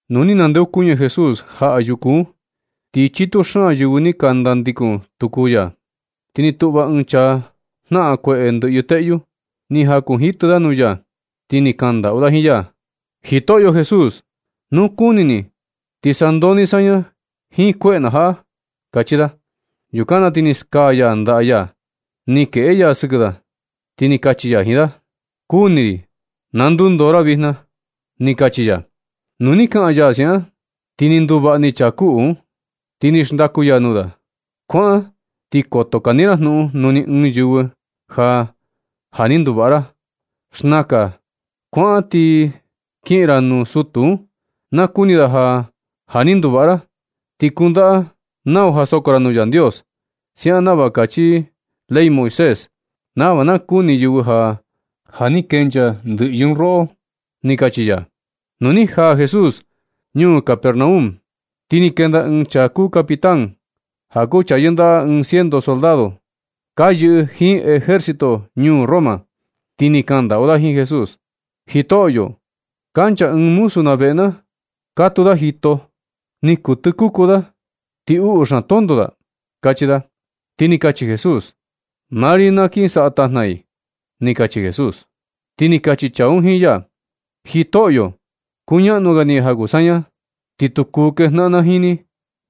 Nu ni nandeokuñɨ Jesús jaꞌa yuku un, ti chitu xaan yɨvɨ ni ka nandikun tuku i ya. Ti ni tuꞌva ɨɨn chaa jnaꞌan kueꞌe ndɨꞌyɨ teꞌyu. Ni jakunjitɨ da nuu ya, ti ni kandaꞌu da jiin ya: ―Jitoꞌyo Jesús, nu kuni ni ti sandoo ni saña jiin kueꞌe na jaꞌa ―kachi da. Yukan na ti ni skaa ya ndaꞌa ya, ni keꞌe ya sɨkɨ da, ti ni kachi ya jiin da: ―Kuni ri, na ndundoo ra vijna ―ni kachi ya. Nu ni kaꞌan ya siaꞌan, ti ni nduvaꞌa ni chaa kuꞌu un. Ti ni xndaku ya nuu da: ―Kuaꞌan, ti koto kani ra jnuꞌun nuu ni ɨɨn yɨvɨ ja, ja ni nduvaꞌa ra. Xnakan, kuaꞌan ti kiꞌin ra nuu sutu un, na kuni da ja, ja ni nduvaꞌa ra. Ti kundaꞌa nau ja soko ra nuu Yandios, siaꞌan nava kachi ley Moisés, nava na kuni yɨvɨ ja, ja ni kenchaa ndɨꞌyɨ un roꞌo ―ni kachi ya. Nu ni jaa Jesús ñuu Capernaum, ti ni kenda ɨɨn chaa kuu capitán, ja kuu chaa yɨndaꞌa ɨɨn ciento soldado, ka yɨꞌɨ jiin ejército ñuu Roma, ti ni kandaꞌu da jiin Jesús: ―Jitoꞌyo, kancha ɨɨn muzu na veꞌe na, katuu i jito, ni kuu tɨkuku i, ti uꞌu xaan tonto i ―kachi da. Ti ni kachi Jesús: ―Maa ri na kin saꞌa tajna i ―ni kachi Jesús. Ti ni kachi chaa un jiin ya: ―Jitoꞌyo, kuñaꞌnu ga ni ja kuu saña, ti tu kuu kejnaꞌan na jiin ni.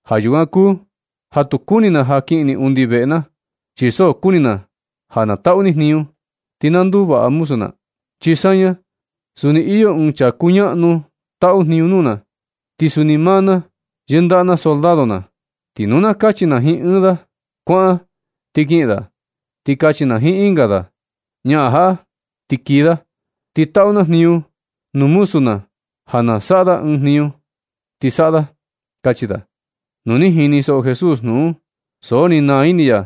Ja yukan kuu ja tu kuni na ja kiꞌin ni undi veꞌe na, chi so kuni na ja na taꞌu ni jniñu, ti na nduvaꞌa muzu na. Chi saña, suni iyo ɨɨn chaa kuñaꞌnu taꞌu jniñu nuu na. Ti suni maa na, yɨndaꞌa na soldado na. Ti nu na kachi na jiin ɨɨn da: “Kuaꞌan”, ti kiꞌin da. Ti kachi na jiin ɨnga: “Ñaꞌan jaꞌa”, ti kii da. Ti taꞌu na jniñu nuu muzu na ja na saꞌa i ɨɨn jniñu un, ti saꞌa i ―kachi da. Nu ni jinisoꞌo Jesús jnuꞌun un, so ni naa ini ya,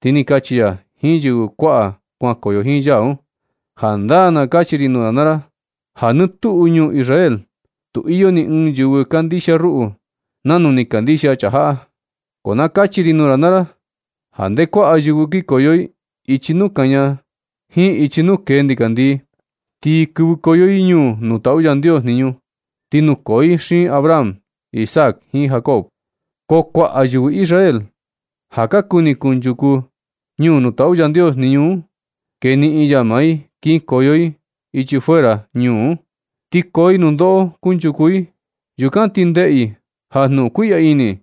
ti ni kachi ya jiin yɨvɨ kuaꞌa kuankoyo jiin ya un: ―Jandaa na kachi ri nuu ra naa ra ja nɨ tuꞌu ñuu Israel, tu iyo ni ɨɨn yɨvɨ kandixia ruꞌu nanu ni kandixia chaa jaꞌa. Ko na kachi ri nuu ra naa ra ja nde kuaꞌa yɨvɨ kikoyo i ichi nuu kaña jiin ichi nuu kee ndikandii, ti kɨvɨkoyo i ñuu nuu taꞌu Yandios jniñu, ti nukoo i xiin Abraham, Isaac, jiin Jacob. Ko kuaꞌa yɨvɨ Israel ja ka kuni kunchuku ñuu nuu taꞌu Yandios jniñu un, keniꞌin ya maa i kinkoyo i ichi fuera ñuu un, ti koo i nundoꞌo kunchuku i. Yukan ti ndeꞌe i ja jnuꞌun kuiꞌya ini,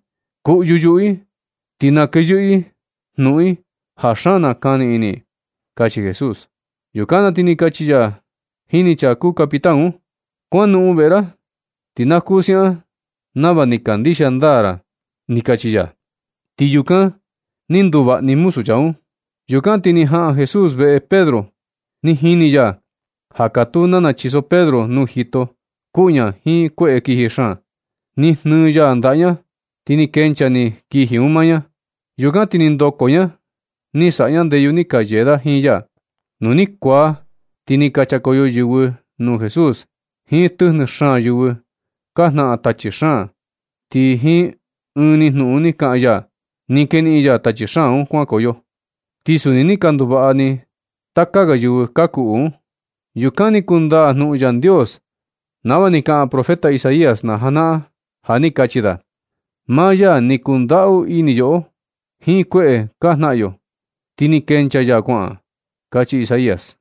kuꞌyu yuꞌu i, ti nakeyɨꞌɨ i jnuꞌun i ja xaan nakani ini i ―kachi Jesús. Yukan na ti ni kachi ya jini chaa kuu capitán un: ―Kuanoꞌon veꞌe ra, ti na kuu siaꞌan nava ni kandixia ndaa ra ―ni kachi ya. Ti un, ni nduvaꞌa ni muzu chaa un. Yukan ti ni jaꞌan Jesús veꞌe Pedro. Ni jini ya ja katuu nana chiso Pedro nuu jito, kuꞌu ña jiin kueꞌe kiji xaan. Ni jnɨɨ ya ndaꞌa ña, ti ni kenchaa ni kiji un maa ña. Yukan ti ni ndoko ña, ni saꞌa ña ndeyu, ni ka yee da jiin ya. Nu ni kuaa, ti ni ka chakoyo yɨvɨ nuu Jesús jiin tɨjnɨ xaan yɨvɨ ka jnaꞌan tachi xaan, ti jiin ɨɨn ni jnuꞌun ni kaꞌan ya, ni keniꞌin ya tachi xaan un kuankoyo. Ti suni ni ka nduvaꞌa ni taka ga yɨvɨ ka kuꞌu un. Yukan ni kundaa jnuꞌun Yandios nava ni kaꞌan profeta Isaías na janaꞌan, ja ni kachi da: “Maa ya ni kundaꞌu ini yoꞌo jiin kueꞌe ka jnaꞌan yo, ti ni kenchaa ya kuaꞌan”, kachi Isaías.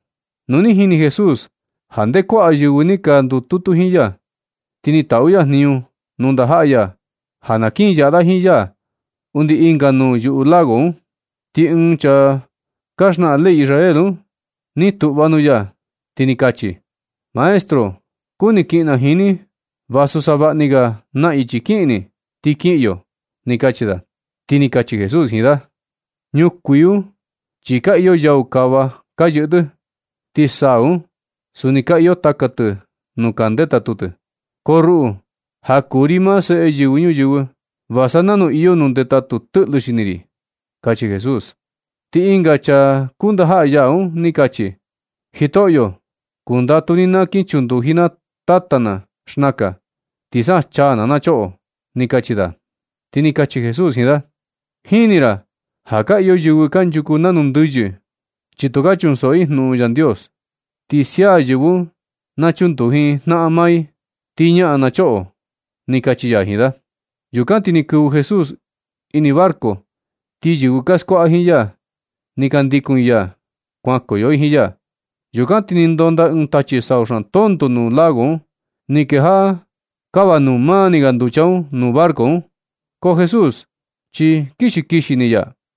Nu ni jini Jesús ja nde kuaꞌa yɨvɨ ni ka ndututu jiin ya, ti ni taꞌu ya jniñu nuu ndajaꞌa ya ja na kin yaꞌa da jiin ya undi ɨnga nuu yuu lago un. Ti ɨɨn chaa ka xnaꞌan ley Israel un ni tuꞌva nuu ya, ti ni kachi: ―Maestro, kuni kiꞌin na jiin ni vasu savaꞌa ni ga na ichi na kiꞌin ni, ti kiꞌin yo ―ni kachi da. Ti ni kachi Jesús jiin da: ―Ñukuii un chi ka iyo yau kava ka yɨꞌɨ tɨ. Ti saa un suni ka iyo taka tɨ nuu ka ndetatu tɨ. Ko ruꞌu, ja kuu ri maa Seꞌe Yɨvɨ Ñuyɨvɨ, va sa nanu iyo nuu ndetatu tɨꞌlɨ xini ri ―kachi Jesús. Ti ɨnga chaa kuu ndajaꞌa ya un ni kachi: ―Jitoꞌyo, kundatu ni na kin chunduji na tata na xnakan, ti sa chaa na, na choꞌo ―ni kachi da. Ti ni kachi Jesús jiin da: ―Jini ra ja ka iyo yɨvɨ kanchuku nanu ndɨyɨ, chi tu ka chunsoꞌo i jnuꞌun Yandios. Ti sia yɨvɨ un na chunduji jnaꞌan maa i, ti ñaꞌan na choꞌo ―kachi ya jiin da. Yukan ti ni kɨvɨ Jesús ini barco, ti yɨvɨ ka skuaꞌa jiin ya, ni ka ndikun i ya kuankoyo i jiin ya. Yukan ti ni ndonda ɨɨn tachi sau xaan tonto nuu lago un, ni kejaꞌa kava nuu mani ga nducha un nuu barco un. Ko Jesús chi kixi kixi ni ya.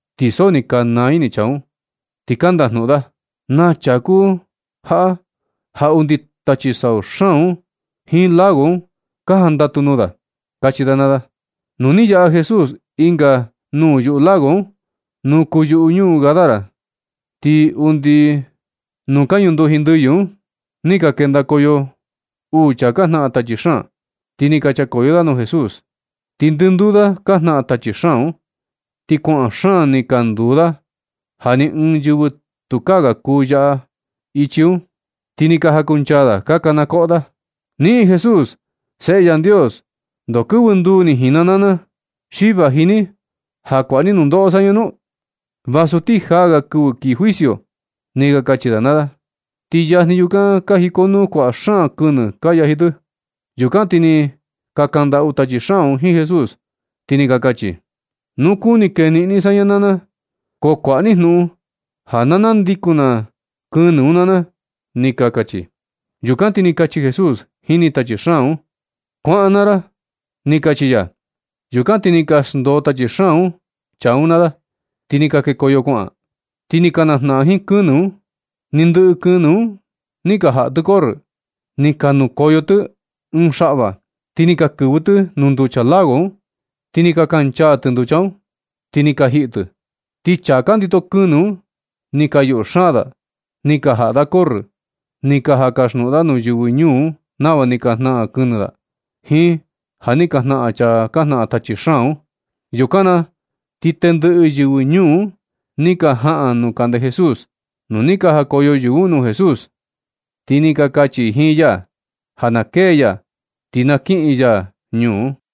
Ti so ni ka naa ini chaa un, ti ka nndajnuꞌun da: ―¡Naa chaa kuu jaꞌa ja undi tachi sau xaan un, jiin lago un ka jandatu nuu da! ―kachi da naa da. Nu ni yaꞌa Jesús ɨnga nuu yuꞌu lago un, nuu kuu yuꞌu ñuu Gadara. Ti undi staa stilateón nuu ka ñunduji ndɨyɨ un ni ka kendakoyo uu chaa ka jnaꞌan tachi xaan, ti ni ka chakoyo da nuu Jesús. Ti ndɨnduu da ka jnaꞌan tachi xaan un, ti kuaꞌan xaan ni ka nduu da ja ni ɨɨn yɨvɨ tukaa ga kuu yaꞌa i ichi un. Ti ni ka jakunchaa da ka kana koꞌo da: ―¡Niꞌin Jesús, Seꞌe Yandios! ¿Ndoo kɨvɨ nduu ni jiin na naa na, xi vaji ni ja kuaꞌa ni nundoꞌo saña nu? Vasu ti jaa ga kɨvɨ kii juicio ―ni ka kachi da naa da. Ti yajni yukan ka jikonuu kuaꞌa xaan kɨnɨ ka yaji tɨ. Yukan ti ni ka kandaꞌu tachi xaan un jiin Jesús, ti ni ka kachi: ―Nu kuni keniꞌin ni saña naa na, ko kuaꞌa ni jnuꞌun ja na nandikun na kɨnɨ un naa na ―ni ka kachi. Yukan ti ni kachi Jesús jini tachi xaan un: ―Kuaꞌan naa ra ―ni kachi ya. Yukan ti ni ka xndoo tachi xaan un chaa un naa da, ti ni ka kekoyo kuaꞌan, ti ni ka najnaꞌan jiin kɨnɨ un. Ni ndɨꞌɨ kɨnɨ un ni ka jaꞌa tɨ corrɨ, ti ni ka nukoyo tɨ ɨɨn xaꞌva, ti ni ka kɨvɨ tɨ nuu nducha lago un, ti ni ka kancha tɨ nducha un, ti ni ka jiꞌi tɨ. Ti chaa ka ndito kɨnɨ un ni ka yuꞌu xaan da, ni ka jaꞌa da corrɨ, ti ni ka jan kasjnuꞌun da nuu yɨvɨ ñuu un nava ni ka jnaꞌan kɨnɨ da, jiin ja ni ka jnaꞌan chaa ka jnaꞌan tachi xaan un. Yukan na ti tendɨꞌɨ yɨvɨ ñuu un ni ka jaꞌan nuu kande Jesús. Nu ni ka jakoyo yɨvɨ un nuu Jesús, ti ni ka kachi i jiin ya ja na kee ya, ti na kiꞌin ya ñuu.